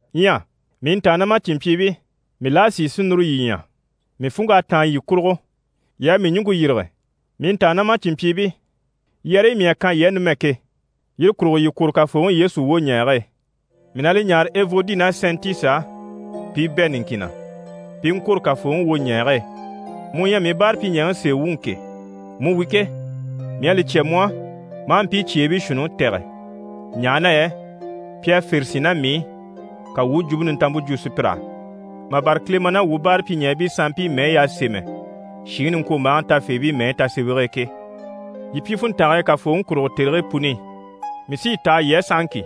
Ɲyɛ mii ntàannamacinmpyiibii, mii la à sìi si núru yii ɲya. Mii funŋk'à táan yii kurugo, yii à mii ɲùŋke yîrige. Mii ntàannamacinmpyiibii, yɛrɛyi mii à kan yii á numɛ ke, yire kurugo, yii kwôro Kafooŋi Yesu wwoɲɛɛge e. Mii na li ɲáare Evodi ná Sɛntisi á, pi i bɛ̂ niŋkin na, pi i ŋkwôro Kafooŋi wwoɲɛɛge e. Mu u ɲyɛ mii báarapyiɲɛɛŋi sèe wuŋi ke, mu wi ke, mii à li cya mu á, ma a mpii cyeebii shuunniŋi tɛ̀gɛ, ɲaha na yɛ pi à fère sín ná mii i, ka wuu u Jwumpe Nintanmpe jwo sùpyir'á, mà bâra Kilema ná wuu báarapyiɲɛɛbii sanmpii mɛyi y'à sémɛ shìŋi niŋkwombaaŋi tafeebii mɛyi tasemɛge e ke. Yii pyi funntange e Kafooŋi kurugo tèrigii puni i. Mii sí yi taha yii á sahaŋki,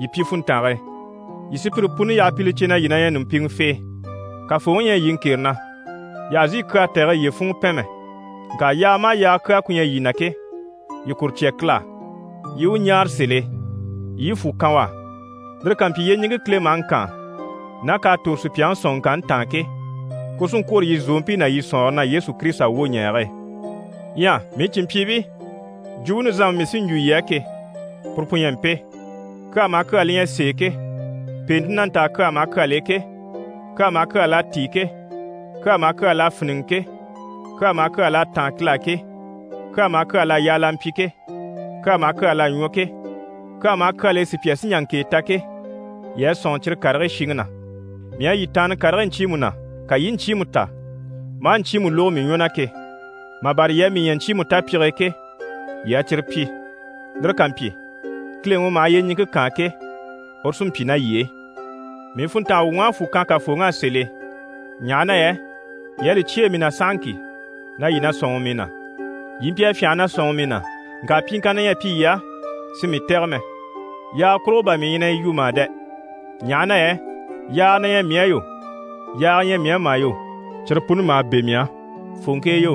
yii pyi funntange e. Yii sùpyire puni yaha pi li cè na yii na ɲyɛ ɲùmpiŋɛfee. Kafooŋi ɲyɛ yii ŋkere na. Yii àha zìi kyaa tɛ̀gɛ yiye funŋɔ pɛn mɛ, ŋka yaaga maha yaaga kyaa ku ɲyɛ yii na ke, yii kuru cya Kile á, yii i u ɲáare sèl'e, yii i fwù kan u á. Lire ká mpyi, yyeɲiŋke Kile maha ŋkaan ná k'à tòro sùpyaŋi sɔ̀nŋɔŋkanni taan ke, kuru sí n-kwôro yii zòompii ná yii sɔ̀nŋɔre na Yesu Kirisita wwoɲɛɛge e. Ɲyɛ mii cìnmpyiibii, jwumpe nizanmpe mii sí n‑jwo yii á ke, puru pu ɲyɛ mpe: kyaa maha kyaa li ɲyɛ sèe ke, pèente na ntaa kyaa maha kyal'e ke, kyaa maha kyaa l'à tíi ke, kyaa maha kyaa l'à fíniŋɛ ke, kyaa maha kyaa l'à táan Kile á ke, kyaa maha kyaa l'à yaa l'a mpyi ke, kyaa maha kyaa l'à ɲwɔ ke, kyaa maha kyal'e sùpya sí n‑jà ŋkèe ta ke, yii a sɔ̂nŋi cyire karigii shiŋi na. Mii à yii taanna karigii ɲcyiimu na, ka yii i ɲcyiimu ta, maa ɲcyiimu lógo mii ɲwɔ na ke, mà bâra yii à mii ɲya ɲcyiimu tapyige e ke, yii a cyire pyi. Lire ká mpyi, Kileŋi u maha yyeɲiŋke kaan ke, uru sí n‑pyi ná yii e. Mii funntanga wuŋ'à fwù kan Kafooŋi á sèl'e, ɲaha na yɛ yii à li cyêe mii na sahaŋki na yii na sɔ̂nŋi mii na. Yii mpyi a fyânha na sɔ̂nŋi mii na, ŋka pyiŋkanna ɲyɛ a mpyi yii á si mii tɛ̀gɛ mɛ. Yaaga kurugo bà mii ɲyɛ na yi yu mà dɛ, ɲaha na yɛ yaaga na ɲyɛ mii á yo, yaaga ɲyɛ mii á mà yo, cyire puni maha bɛ̂ mii á. Fòŋke e yo,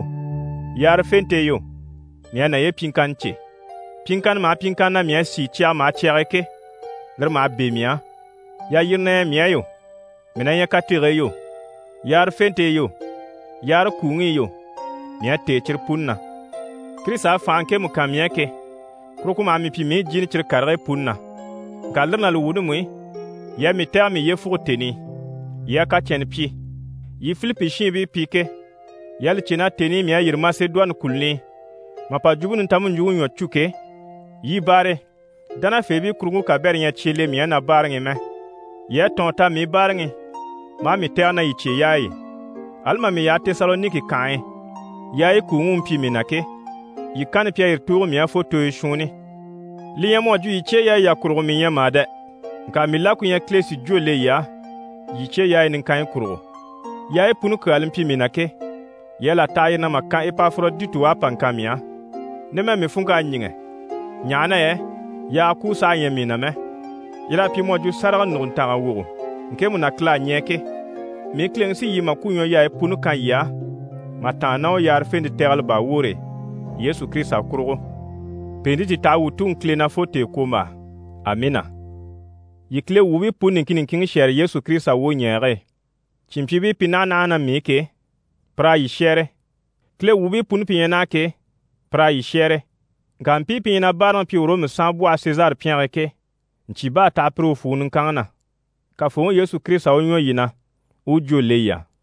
yaarafente e yo, mii à naye pyiŋkanni cè. Pyiŋkanna maha pyiŋkanna na mii à sìi cyaga maha cyag'e ke, lire maha bɛ̂ mii á. Yalyire na ɲyɛ mii á yo, mii na ɲyɛ katege e yo, yaarafente e yo, yaare kuuŋi i yo, mii à têe cyire puni na. Kirisita à fànhe ŋkemu kan mii á ke, kuru ku maha mii pyi mii u jìni cyire karigii puni na. Ŋka lire ná li wuuni mú i, yii à mii tɛ̀gɛ mii yyefuge tèni i, yii à kacɛnnɛ pyi. Yii Filipi shiinbii pi ke, yii à li cè na tèni i mii à yîri Masedoni kùluni i mà pa Jwumpe Nintanmpe ɲjwuŋi ɲwɔ cû ke, yii baare e, dánafeebii kuruŋke kabɛrɛ ɲyɛ a cye le mii á na báaraŋi i mɛ. Yii à tɔ̀ɔn ta mii báaraŋi i, maa mii tɛ̀gɛ ná yii cyeyaayi i. Ali mà mii yaha Tesaloniki kànhe e, yaayi kuuŋi u mpyi mii na ke, yii kanni pi à yire tùugo mii á fo tooyo shuunni. Li ɲyɛ mu à jwo yii cyeyaayi yà kurugo mii ɲyɛ mà dɛ, ŋka mii la ku ɲyɛ Kile si jwó le yii á, yii cyeyaayi niŋkanyi kurugo. Yaayi puni kyaa li mpyi mii na ke, yii à là taha yire na mà kan Epaforoditi u à pa ŋkan mii á. Numɛ mii funŋk'à ɲíŋɛ, ɲaha na yɛ yaaga kuu saha ɲyɛ mii na mɛ. Yir'à pyi mu à jwo sáraga nùguntanga wogo ŋkemu na Kile à ɲɛɛ ke. Mii Kileŋi sí yii màkwuɲwɔyaayi puni kan yii á mà tàanna ná u yaarafente tɛgɛlɛ baa woore e, Yesu Kirisita kurugo. Pèente ti taha wuu Tuŋi Kile na fo tèekwombaa. Amiina! Yii Kile wuubii puni niŋkin niŋkin shɛ́ɛre Yesu Kirisita wwoɲɛɛge e. Cìnmpyiibii pi naha naha ná mii i ke, pir'à yii shɛ́ɛre. Kile wuubii puni pi ɲyɛ naha ke, pir'à yii shɛ́ɛre. Ŋka mpii pi ɲyɛ na báaraŋi pyi Ɔrɔmu saanbwɔhe Sezari pyɛnge e ke, ɲcyì bá a taha pire u fwùŋi niŋkanŋi na. Kafooŋi Yesu Kirisita u ɲwɔ yii na, u u jwó le yii á.